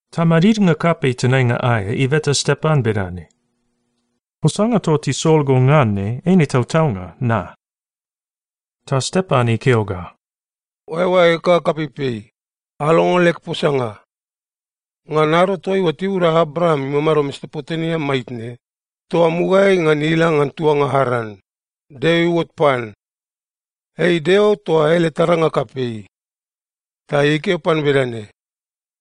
Ta madidnga kapei tenainga aea ibeta Stepan bedane, “Posanga toa tisol go ngan ne, eine tautaunga na?” Ta Stepan ikeo ga, “Oaeoaeg ga kapeipei, alongo leg posanga. Ngan ado toaiua tibuda Abraam imamado Mesopotemia maitne, toa mugaeai ngan ila ngan tuanga Aran, Deo iuot pan. Ei Deo toa ele taranga kapei. Ta ikeo pan bedane,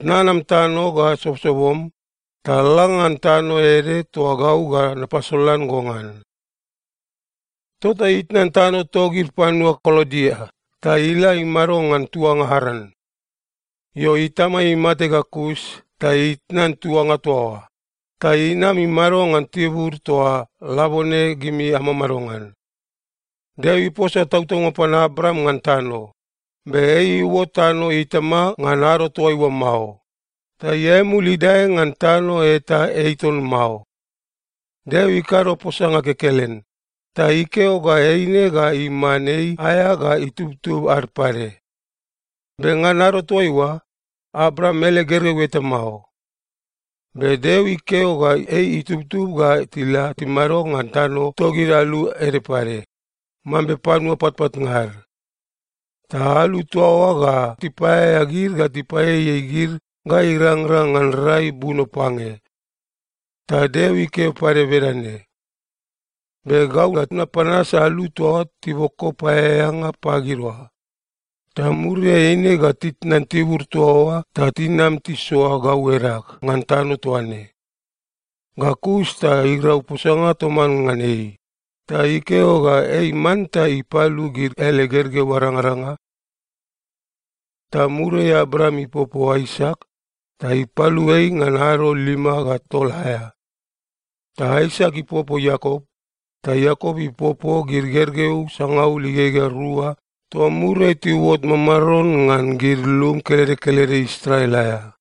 ‘Tnan am tano ga sobosobom, ta la ngan tano ede toa gau ga napasolan go ngan.’ “Tota itnan tano togid panua Kaldia ta ila imado ngan tuanga Aran. Io, itama imate ga kus ta itnan tuanga toa oa, ta inam imado ngan tibur toa labone gimi amamado ngan. Deo iposa tautaunga pan Abraam ngan tano, be ei iuot tano itama ngan ado toaiua mao, ta iae mul idae ngan tano eta ei ton mao. Deo ikado posanga kekelen, ta ikeo ga eine ga iman ei aea ga itubtub ad pade. Be ngan ado toaiua, Abraam ele gergeu eta mao. Be Deo ikeo ga ei itubtub ga tila timado ngan tano togid alu ede pade, mambe panua patpatnga ad. Ta alu toa oa ga tipaeaea gid ga tipaieiei gid ga irangrang ngan rai buno pange. Ta Deo ikeo pade bedane, ‘Be gau ga napanas alu toa tiboko paeaeanga pagid oa, ta muriai eine ga titnan tibur toa oa ta tinam tisoa gau edag ngan tano toa ne.’ Ga kus ta irau posanga toman ngan ei, ta ikeo ga ei manta ipalu gid ele gergeu arangaranga. Ta muriai Abraam ipopo Aisak, ta ipalu ei ngan ado lima ga tol aea. Ta Aisak ipopo Iakop, ta Iakop ipopo gid gergeu sangaul igegea rua toa muriai tiuot mamaron ngan gid lum kelede kelede Israel aea.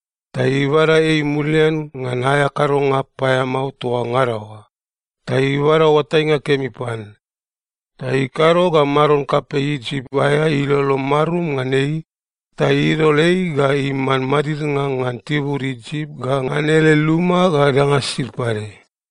Ta ibada ei mulian ngan aea kadonga paeamao toa ngada oa, ta ibada oatainga kemi pan, ta ikado ga maron kapei Isip aea ilolo marum ngan ei, ta idol ei ga iman madidnga ngan tibur Isip ga ngan ele luma ga danga sisid pade.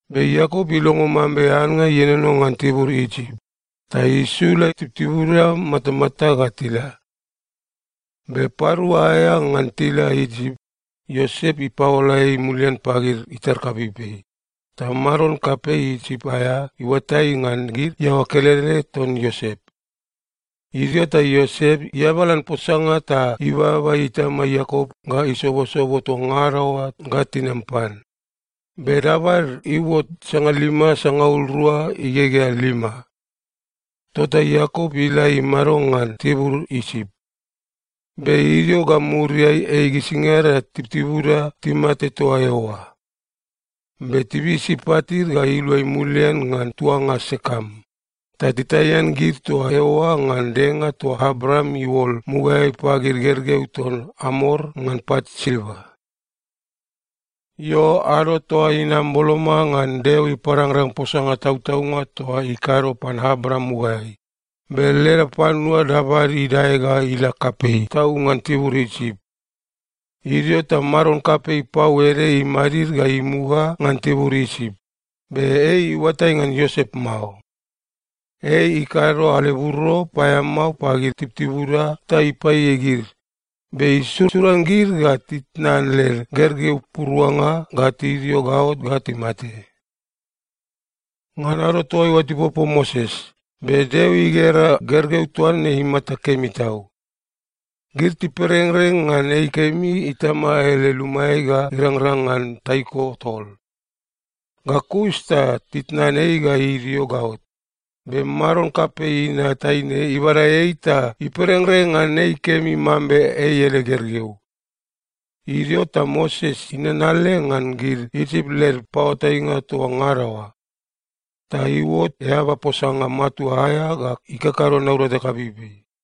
Be Iakop ilongo mambe annga ienono ngan tibur Isip, ta isula tibutibuda matamata ga tila. Be parua aea ngan tila Isip, Iosep ipaola ei mulian pagid itar kapeipei, ta maron kapei Isip aea iuatai ngan gid iaoa kelede ton Iosep. Idio ta Iosep iabalan posanga ta ibaba itama Iakop ga isobosobo toa ngada oa ga tinam pan, be dabad iuot sangalima sangaul rua igegea lima. Tota Iakop ila imado ngan tibur Isip. Be idio ga muriai ei gisingada tibutibuda timate toa eoa. Be tibisi patid ga iluai mulian ngan tuanga Sekem, ta titaian gid toa eoa ngan denga toa Abraam iuol mugaeai pagid gergeu ton Amor ngan pat silva. “Io, ado toa inam boloma ngan Deo iparangrang posanga tautaunga toa ikado pan Abraam mugaeai, be leda panua dabad idae ga ila kapei tau ngan tibur Isip. Idio ta maron kapei pau ede imadid ga imuga ngan tibur Isip, be ei iuatai ngan Iosep mao. Ei ikado aleburo paeamao pagid tibutibuda ta ipaieiei gid, be isusuran gid ga titnan led gergeu puruanga ga tidio gaot ga timate. “Ngan ado toaiua tipopo Moses, be Deo igera gergeu toa ne imata kemi tau. Gid tiperengreng ngan ei kemi itama ele lumaeai ga irangrang ngan taiko tol. Ga kus ta titnan ei ga idio gaot, be maron kapei inat taine ibada ei ta iperengreng ngan ei kemi mambe ei ele gergeu. Idio ta Moses inanale ngan gid Isip led paoatainga toa ngada oa. Ta iuot eaba posanga matua aea ga ikakado naurata kapeipei.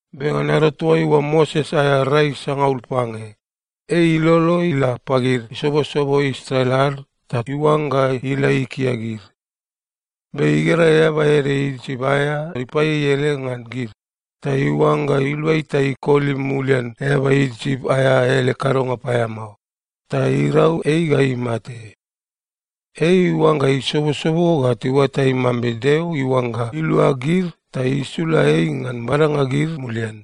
“Be ngan ado toaiua Moses aea rai sangaul pange, ei ilolo ila pagid isobosobo Israel ad ta iuangga ila ikia gid. Be igera eaba ede Isip aea ipaieiei ede ngan gid, ta iuangga ilua ei ta ikoli mulian eaba Isip aea ele kadonga paeamao, ta irau ei ga imate. Ei iuangga isobosobo ga tiuatai mambe Deo iuangga ilua gid ta isula ei ngan badanga gid mulian,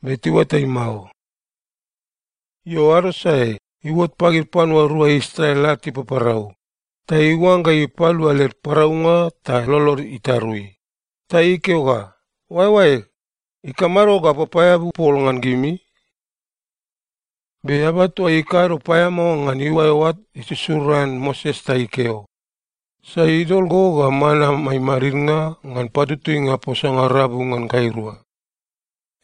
be tiuatai mao. Io, ado sae, iuot pagid panua rua Israel ad tipaparau, ta iuangga ipalua led paraunga ta lolod itarui, ta ikeo ga, ‘Oaeoaeg, ikamado ga apapaeabu pol ngan gimi?’ “Be eaba toa ikado paeamao ngan iuae oa isusuran Moses ta ikeo, ‘Sai idol go ga man amai madidnga ngan patutuinga posanga rabu ngan gairua?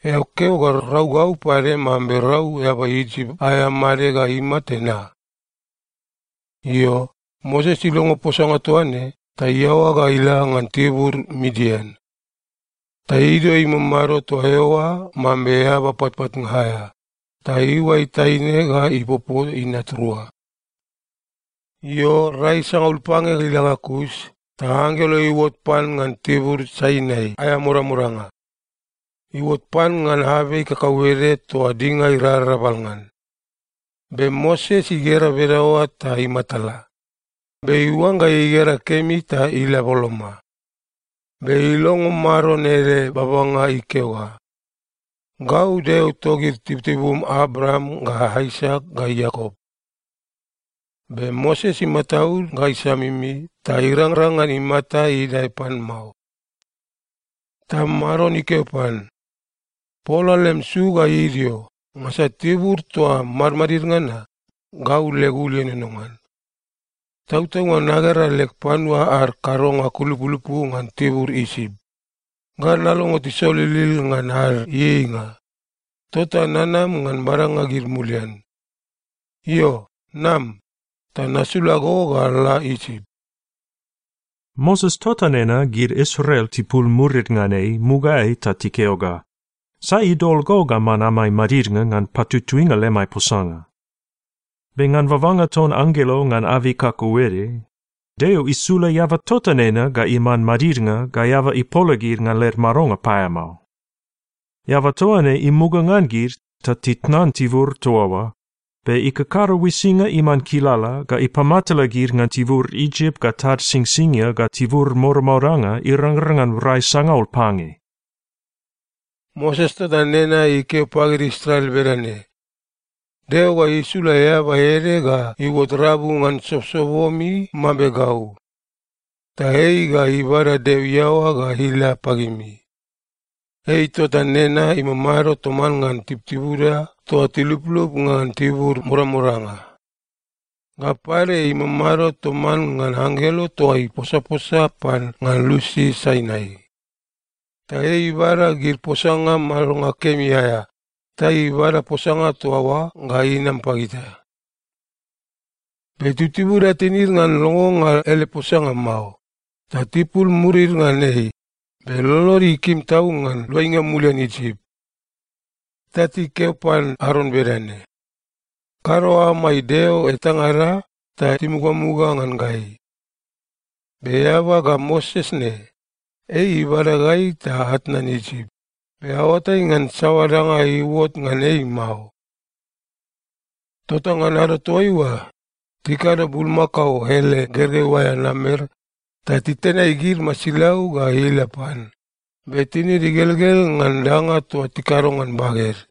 Eao keo ga rau gau pade mambe rau eaba Isip aea made ga imate na?’ Io, Moses ilongo posanga toa ne, ta iaoa ga ila ngan tibur Midian. Ta idio imamado toa eoa mambe eaba patpatnga aea, ta iuai taine ga ipopo inat rua. “Io, rai sangaul pange ila ga kus, ta anggelo iuot pan ngan tibur Sainai aea modamodanga. Iuot pan ngan abei kakauede toa dinga irarabal ngan. Be Moses igera bedaoa ta imatala, be iuangga igera kemi ta ila boloma. Be ilongo Maron ele babanga ikeo ga, ‘Gau Deo togid tibutibum Abraam ga Aisak ga Iakop.’ Be Moses imataud ga isamimi, ta irangrang ngan imata idae pan mao. “Ta Maron ikeo pan, ‘Pola lem su ga idio, ngansa tibur toa madmadid ngan na, gau leg ul ienono ngan. Tautaunga nagera leg panua ad kadonga kulupulupu ngan tibur Isip, ga nalongo tisolilil ngan ad ieieinga, tota nanam ngan badanga gid mulian. Io, nam, ta nasula go ga la Isip.’ “Moses tota nena gid Israel tipul murid ngan ei mugaeai ta tikeo ga, ‘Sai idol go ga man amai madidnga ngan patutuinga lemai posanga?’ Be ngan babanga ton anggelo ngan abei kakauede, Deo isula eaba tota nena ga iman madidnga ga eaba ipola gid ngan led madonga paeamao. Eaba toa ne imuga ngan gid, ta titnan tibur toa oa, be ikakado uisinga iman kilala ga ipamatala gid ngan tibur Isip ga tad Singsingia ga tibur modamodanga irangrang ngan rai sangaul pange. “Moses tota nena ikeo pagid Israel bedane, ‘Deo ga isula eaba ede ga iuot rabu ngan sobosobomi mambe gau, ta ei ga ibada Deo iaoa ga ila pagimi.’ Ei tota nena imamado toman ngan tibutibuda toa tiluplup ngan tibur modamodanga. Ga pade, imamado toman ngan anggelo toa iposaposa pan ngan lusi Sainai. Ta ei ibada gid posanga madonga kemi aea, ta ibada posanga toa oa ga inam pagita. “Be tibutibuda tinid ngan longonga ele posanga mao, ta tipul murid ngan ei, be lolod ikim tau ngan luainga mulian Isip. Ta tikeo pan Aron bedane, ‘Kado amai deo etangada ta timugamuga ngan gai. Be eaba ga Moses ne, ei ibada gai ta atnan Isip, be aoatai ngan saoa danga iuot ngan ei mao.’ Tota ngan ado toaiua, tikado bulmakao ele gergeu aea namer, ta titenai gid masilau ga ila pan, be tinid igelgel ngan danga toa tikado ngan baged.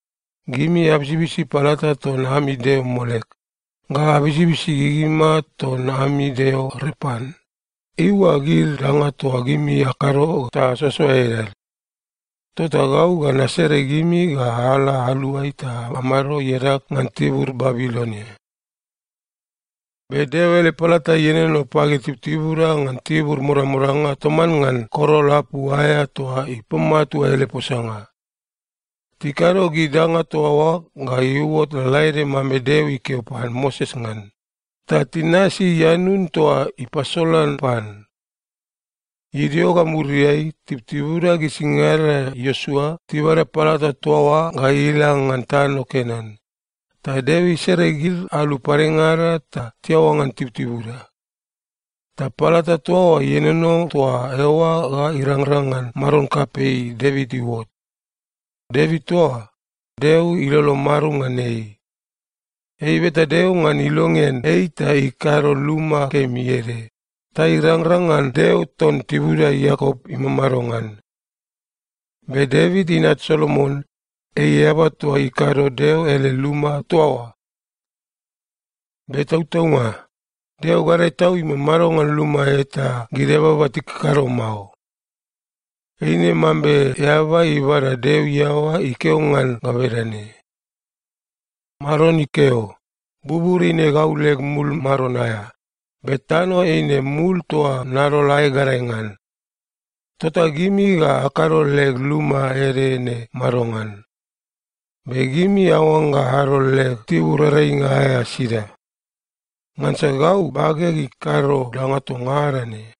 Gimi abisibisi palata ton ami deo Molek, ga abisibisi gigima ton ami deo Repan, eiua gid danga toa gimi akado ta asoasoa edad. Tota gau ga nasere gimi ga ala aluai ta amado iadag ngan tibur Babilonia.’ “Be Deo ele palata ienono pagid tibutibuda ngan tibur modamodanga toman ngan korol apu aea toa ipamatua ele posanga. Tikado gid danga toa oa ga iuot lalaede mambe Deo ikeo pan Moses ngan, ta tinasi ianun toa ipasolan pan. Idio ga muriai, tibutibuda gisingada Iosua tibada palata toa oa ga ila ngan tano Kenan, ta Deo isere gid alu padengada ta tiaoa ngan tibutibuda. Ta palata toa oa ienono toa eoa ga irangrang ngan maron kapei Devit iuot. Devit toa, Deo ilolo marum ngan ei. Ei ibeta Deo ngan ilongean ei ta ikado luma kemi ede, ta irangrang ngan Deo ton tibuda Iakop imamado ngan. Be Devit inat Solomon, ei eaba toa ikado Deo ele luma toa oa. “Be tautaunga, Deo Gadae Tau imamado ngan luma eta gid eababa tikakado mao. Eine mambe eaba ibada Deo iaoa ikeo ngan ga bedane, “‘Maron ikeo: Bubur eine gau leg mul maron aea, be tano eine mul toa nadol aeg gadae ngan. Tota gimi ga akado leg luma ede ne madongan? Be gimi aoangga adol leg tibur earainga aea sida? Ngansa gau bageg ikado danga toa ngada ne!’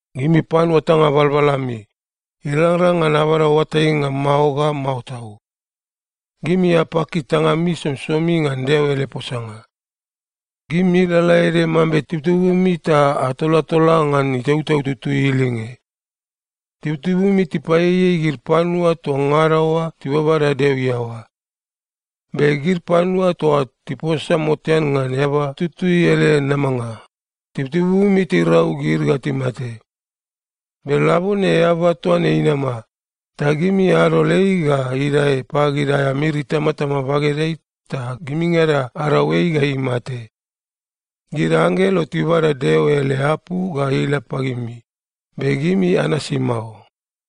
“Gimi panua tanga balbal ami! Irangrang ngan abada oatainga mao ga mao tau. Gimi apaki tangami somisomi ngan Deo ele posanga. Gimi lalaede mambe tibutibumi ta atolatola ngan Itautau Tutui ilinge. Tibutibumi tipaieiei gid panua toa ngada oa tibabada Deo iaoa. Be gid panua toa tiposa motean ngan Eaba Tutui ele namanga, tibutibumi tirau gid ga timate. Be labone eaba toa ne inama, ta gimi adol ei ga idae pagid aea miri itamatama bagedeai ta gimingada arau ei ga imate. Gid anggelo tibada Deo ele apu ga ila pagimi, be gimi anasi mao.”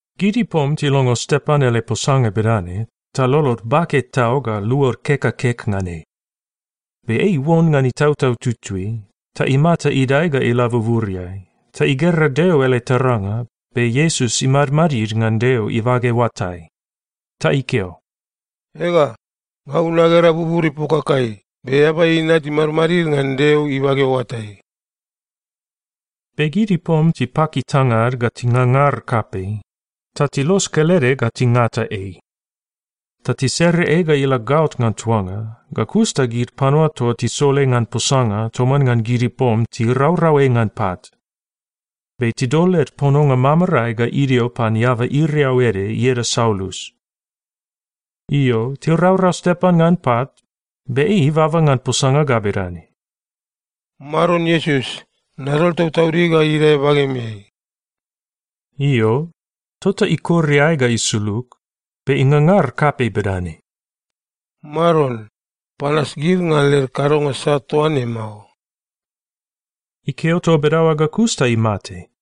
Gid ipom tilongo Stepan ele posanga bedane, ta lolod bake tau ga luod kek ga kek ngan ei. Be ei iuon ngan Itautau Tutui, ta imata idae ga ila buburiai, ta igera Deo ele taranga, be Iesus imadmadid ngan Deo ibage oatai. Ta ikeo, “Ega, gau nagera bubur ipokakai be Eaba Inat imadmadid ngan Deo ibage oatai!” Be gid ipom tipaki tangad ga tingangar kapei, ta tilos kelede ga tingata ei. Ta tisere ei ga ila gaot ngan tuanga, ga kus ta gid panua toa tisol ei ngan posanga toman ngan gid ipom tiraurau ei ngan pat. Be tidol led pononga mamarae ga idio pan eaba iriau ede ieda Saulus. Io, tiraurau Stepan ngan pat, be ei ibaba ngan posanga ga bedane, “Maron Iesus, nadol tautaudig ga idae bagemeai!” Io, tota ikor iae ga isulug, be ingangar kapei bedane, “Maron, panas gid ngan led kadonga sat toa ne mao!” Ikeo toa bedaoa ga kus ta imate.